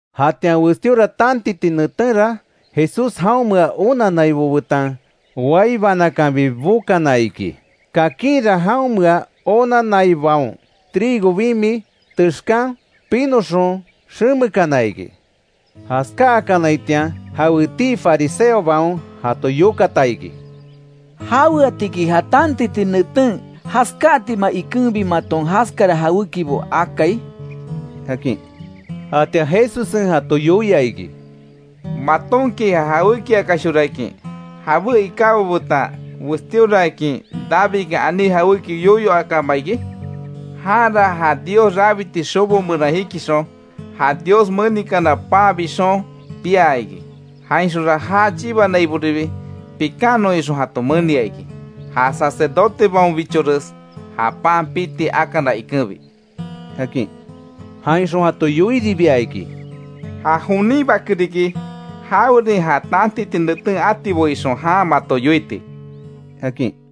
Jatian westíora tantiti netenra, Jesús jaonmea onannaibo betan, wai banakanbi bokana iki. Kakinra jaonmea onanaibaon trigo bimi texkan pinoxon xemekana iki. Jaskáakanaitian jawetii fariseobaon jato yokata iki: —¿Jaweatiki ja tantiti neten jaskáatima ikenbi maton jaskara jawékibo akai? —akin. Jatian Jesussen jato yoia iki: —¿Matonki ja jawékiakashorakin, jabé ikábo betan westíoraakin Davidkan aní jawéki yoyo akáma iki? Janra ja Dios rabiti xobo meran jikixon, ja Dios menikana pan bixon pia iki. Jainxonra já chibanaiboribi, pikannon ixon jato menia iki, ja sacerdotebaonbichores ja pan piti akana ikenbi —akin. Jainxon jato yoiribia iki: —Ja jonin Bake riki, jawerin ja tantiti neten atibo ixon jan mato yoiti —akin.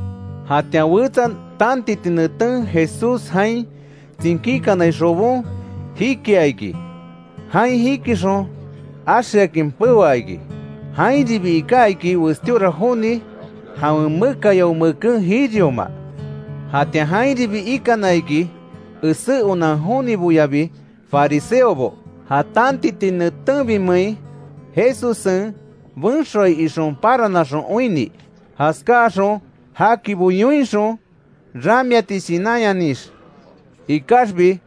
Jatian wetsa tantiti neten, Jesús jain tsinkíkanai xobon jikia iki. Jain jikixon axeakin peoa iki. Jainribi iká iki, westíora joni jawen mekayao meken jirioma. Jatian jainribi ikana iki esé onan joniboyabi fariseobo; ja tantiti netenbimein Jesussen benxoai ixon paranaxon oinni. Jaskáaxon jakibo yoinxon ramiati shinanyanix. Ikaxbi,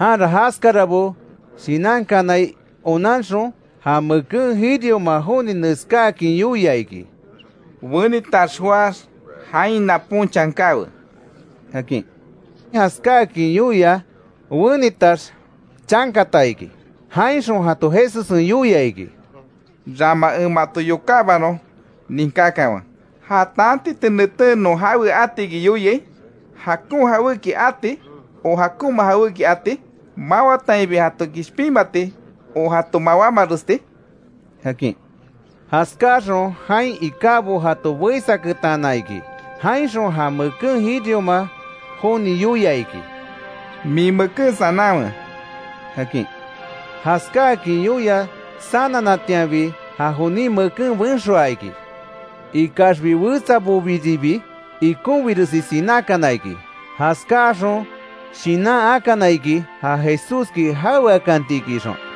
janra jaskarabo shinankanai onanxon, ja meken jirioma joni neskáakin yoia iki: —Wenitax joáx, jain napon chankawe —akin. Jaskáakin yoia, wenitax chankata iki. Jainxon jato Jesussen yoia iki: —Rama en mato yokábanon ninkákanwe: ¿Ja tantiti neten non jawe atiki yoiai? ¿Jakon jawéki ati ó jakonma jawéki ati? ¿Mawatainbi jato kishpinmati, ó jato mawámaresti? —akin. Jaskáaxon jain ikábo jato beísaketana iki; jainxon ja meken jirioma joni yoia iki: —Min meken sananwe —akin. Jaskáakin yoia sananatianbi, ja jonin meken benxoa iki. Ikaxbi wetsabobiribi ikonbiresi sinákana iki, jaskáaxon shinan akana iki, ja Jesúski jaweakantiki ixon.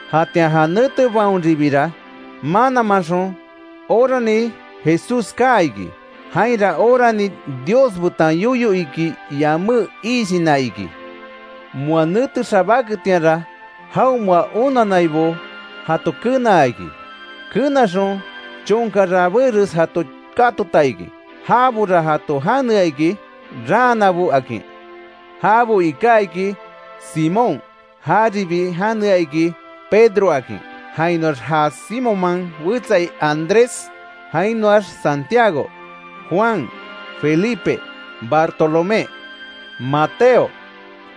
Jatian ja netebaonribira mananmanxon orani Jesús kaa iki. Jainra orani Dios betan yoyo iki yamé iishina iki. Moa nete xabáketianra, jaonmea onannaibo jato kenaa iki. Kenaxon chonka rabéres jato katota iki; jabora jato janea iki, raanabo akin. Jabo iká iki: Simón, jaribi janea iki Pedro akin; jainoax ja Simonman wetsa Andrés, jainoax Santiago, Juan, Felipe, Bartolomé, Mateo,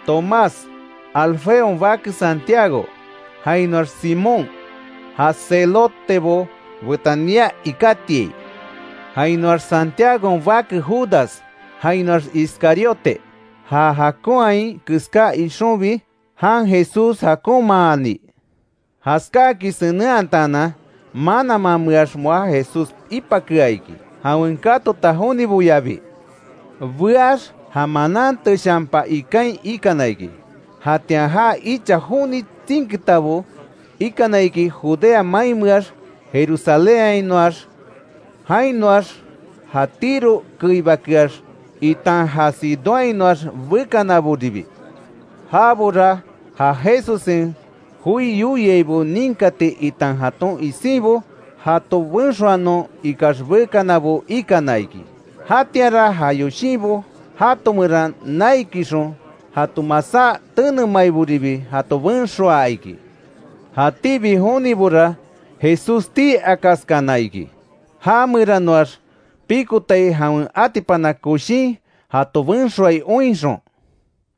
Tomás, Alfeon bake Santiago, jainoax Simón, ja Zelotebo betan nia ikátiai, Jainoax Santiagon bake Judas, jainoax Iscariote, ja jakonhai keská ixonbi jan Jesús jakonmaani. Jaskáakin senenhataanan, mananmameax moa Jesús ipakea iki; jawen katota joniboyabi. Beax ja manan teshanpa ikain ikana iki; Jatian ja icha joni tsinkitabo ikana iki Judea mainmeax, Jerusalénhainoax, jainoax ja Tiro keibakeax, itan ja Sidónhainoax bekanaboribi. Jabora ja Jesussen joi yoiaibo ninkati itan jaton isinbo jato benxoanon ikax bekanabo ikana iki. Jatianra ja yoshinbo jato meran naikixon, jato masá tenemaiboribi jato benxoaa iki. Jatíbi jonibora Jesús tii akaskana iki, já meranoax pikotai jawen atipana koshin jato benxoai oinxon.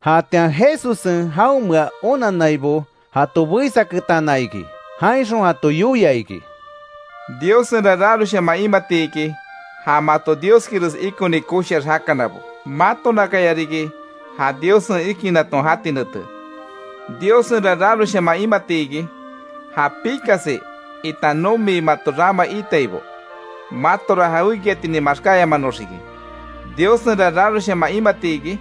Jatian Jesussen jaonmea onannaibo jato beísaketana iki; jainxon jato yoia iki: “Diossenra raroshaman imati iki, ja mato Dioskires ikoni koshiax jakanabo. Matonakayariki ja Diossen ikinaton jati nete. Diossenra raroshaman imati iki, ja pikasi, itan nomi mato rama iitaibo. Matora jawekiatinin maxkáyamanonxiki. Diossenra raroshaman imati iki,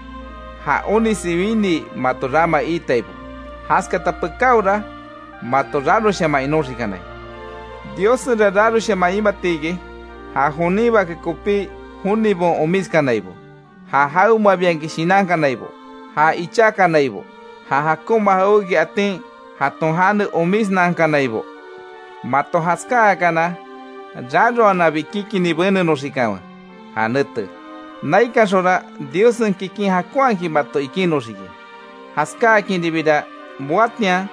ja onisi winii mato rama iitaibo; jaskata pekáora mato raroshaman inoxikanai. Diossenra raroshaman imati iki, ja jonin Bake kopí, jonibaon omiskanaibo, ja jawemabiakin shinankanaibo, ja ichákanaibo, ja jakonma jawéki atin, jaton jane omisnankanaibo. Mato jaskáakana raroananbi kikini benenoxikanwe ja nete. Naikanxonra Diossen kikin jakonhakin mato ikinoxiki. Jaskáakinribira, moatian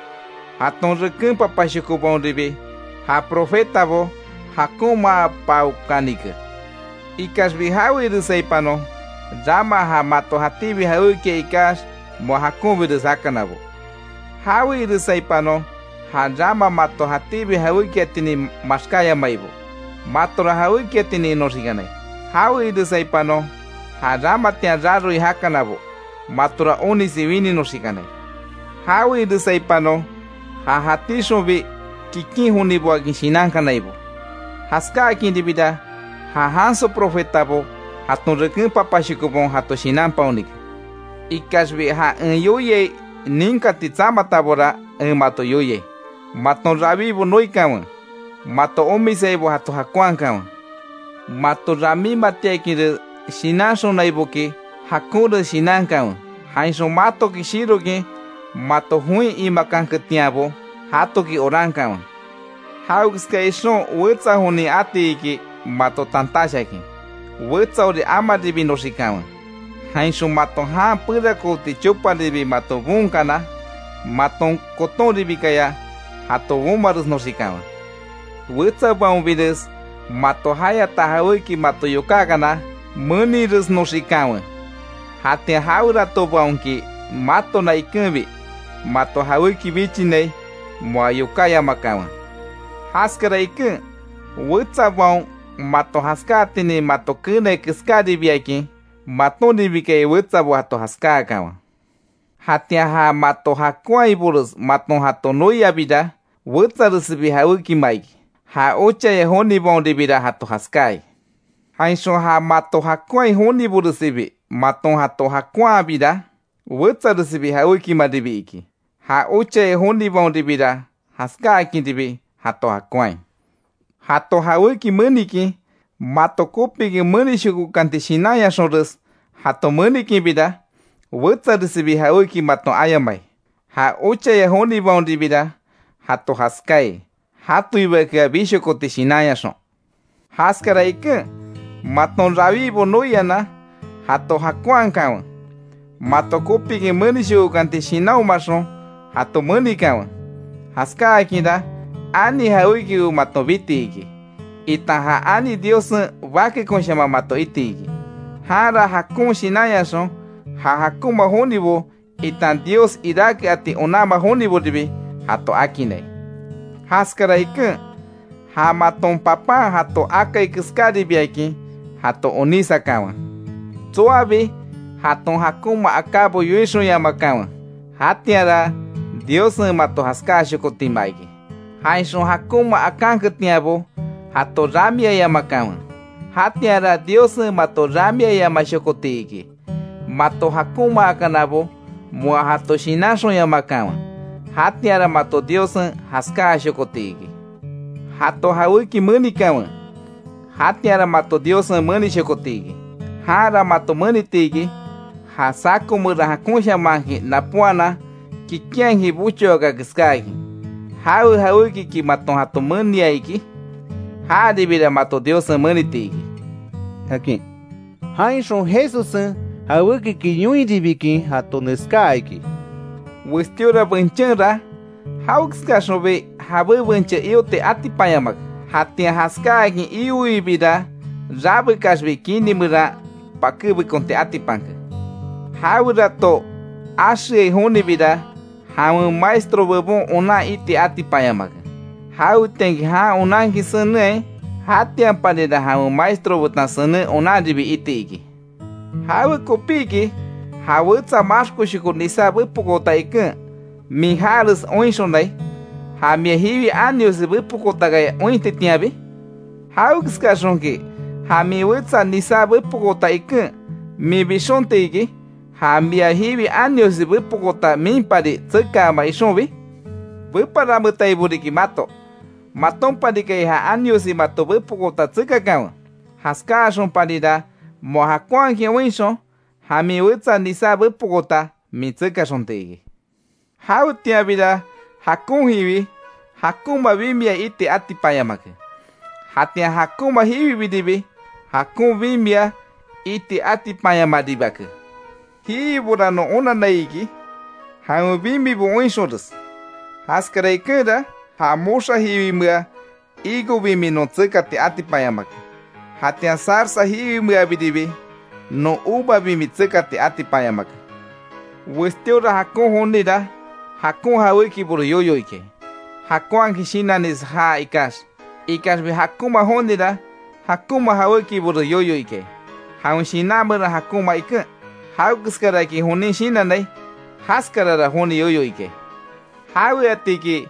jaton reken papashokobaonribi ja profetabo jakonmaapaokanike. Ikaxbi, ¡Jawe iresaipanon, rama ja mato jatíbi jawékia ikax moa jakonbires jakanabo! ¡Jawe iresaipanon, ja rama mato jatíbi jawékiatinin maxkáyamaibo, matora jawékiatinin inoxikanai! ¡Jawe iresaipanon, ja ramatian raroi jakanabo, matora onisi wininoxikanai! ¡Jawe iresaipanon, ja jatíxonbi kikin joniboakin shinankanaibo! Jaskáakinribira ja janso profetabo, jaton reken papashokobaon jato shinanpaonike. Ikaxbi, ja en yoiai ninkati tsamatabora en mato yoiai: Maton rawibo noikanwe, mato omisaibo jato jakonhakanwe. Mato ramímatiakinres shinanxonaiboki, jakonres shinankanwe. Jainxon matoki shirokin mato join imakanketianbo, jatoki orankanwe. Jawekeska ixon wetsa jonin ati iki mato tantash akin; wetsaori amaribinoxikanwe, jainxon mato jan perakooti choparibi mato boonkana, maton kotonribikaya jato bomaresnoxikanwe. Wetsabaonbires mato jayata jawéki mato yokákana; meniresnoxikanwe. Jatian jaweratobaonki matona ikenbi mato jawéki bichinai, moa yokáyamakanwe. Jaskara iken, wetsabaon mato jaskáatinin mato keenai keskáribiakin, matonribikaya wetsabo jato jaskáakanwe. Jatian ja mato jakonhaibores maton jato noiabira, wetsaresibi jawékima iki; ja ochaya jonibaonribira jato jaskáai. Jainxon ja mato jakonhai joniboresibi, maton jato jakonhabira, wetsaresibi jawékimaribi iki, ja ochaya jonibaonribira jaskáakinribi jato jakonhai. Jato jawéki menikin, mato kopikin menishkokanti shinanyaxonres jato menikinbira, wetsaresibi jawéki maton ayamai; ja ochaya jonibaonribira jato jaskáai, jatoibakea bishokoti shinanyaxon. Jaskara iken, maton rawíbo noianan jato jakonhakanwe; mato kopikin menishokokanti shinanhomaxon jato menikanwe. Jaskáakinra ani jawékibo maton biti iki, itan ja ani Diossen bakekonshaman mato iti iki. Janra jakon shinanyaxon, ja jakonma jonibo itan Dios iráke ati onanma joniboribi jato akinnai. Jaskara iken, ja maton Papan jato akai keskáribiakin, jato onísakanwe. Tsoabi jaton jakonma akábo yoixonyamakanwe; jatianra Diossen mato jaskáashokotima iki. Jainxon jakonma akanketianbo, jato ramiayamakanwe; jatianra Diossen mato ramiayamashokoti iki. Mato jakonmaakanabo moa jato shinanxonyamakanwe; jatianra mato Diossen jaskáashokoti iki. Jato jawéki menikanwe; jatianra mato Diossen menishokoti iki. Janra mato meniti iki; ja saco meran jakonshamanhakin napóanan, kikinhakin bochoaka keskáakin. Jawe jawékiki maton jato menia iki, jaribira mato Diossen meniti iki”, akin. Jainxon Jesussen jawékiki yoinribikin jato neskaa iki: “Westíora benchenra, jawekeskaxonbi jabé benche ioti atipanyamake; jatian jaskáakin ioibira rabekaxbi kini meran pakébekonti atipanke. Jawerato axeai jonibira, jawen maestro bebon onan iti atipanyamake. Jawetianki jan onankin senenhai, jatianparira jawen maestro betan senen onanribi iti iki. ¿Jawekopiki ja wetsa maxkoshoko nisá bepokoota iken, min jares oinxonai; ja mia jiwi aniosi bepokootakaya ointitianbi? ¿Jawekeskaxonki ja min wetsa, nisá bepokoota iken, min bixonti iki; ja mia jiwi aniosi bepokoota, minbipari tsekaama ixonbi? ¡Beparametaibo riki mato!, matonparikaya ja aniosi mato bepokoota tsekakanwe. Jaskáaxonparira moa jakonhakin oinxon, ja min wetsa nisá bepokoota min tsekaxonti iki. Jawetianbira jakon jiwi, jakonma bimia iti atipanyamake, jatian ja jakonma jiwibiribi, jakon bimia iti atipanyamaribake. Jiwibora non onanai iki, jawen bimibo oinxonres. Jaskara ikenra, ja moxa jiwimea higo bimi non tsekati atipanyamake; jatian zarza jiwimeabiribi non uva bimi tsekati atipanyamake. Westíora jakon jonira jakon jawékibores yoyo ikai; jakonhakin shinanires jaa ikax; ikaxbi jakonma jonira jakonma jawékibores yoyo ikai, jawen shinan meran jakonma iken. Jawekeskaraki jonin shinannai, jaskarara joni yoyo ikai. ¿Jaweatiki,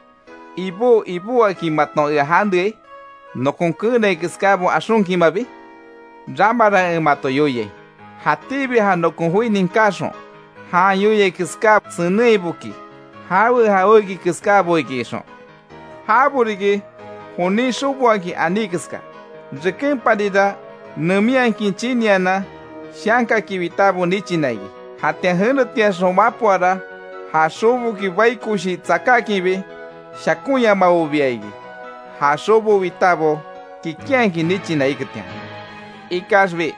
‘Ibó, Ibó’, akin maton ea janeai, nokon keenai keskábo axonkinmabi? Ramara en mato yoiai, jatíbi ja nokon joi ninkáxon jan yoiai keská senenhaiboki, jawe jawéki keskábo iki ixon. Jabo riki jonin xoboakin aní keska; rekenparira neminhakin chinianan, shankaki witábo nichina iki. Jatian jenetiaxon mapoara, ja xoboki bai koshi tsakákinbi shakonyamabobia iki; ja xobo witabo kikinhakin nichina iketian. Ikaxbi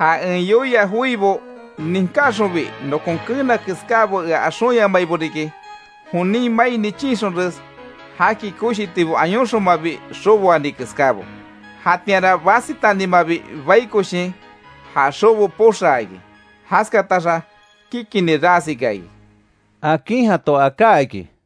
ja en yoia joibo ninkáxonbi, nokon keena keskábo ea axonyamaibo riki; jonin mai chinixonres, jaki koshitibo ayonxonmabi xoboani keskábo. Jatianra basitanima bai koshin, ja xobo poxaa iki; jaskataxa kikini ras ika iki”, akin jato aká iki.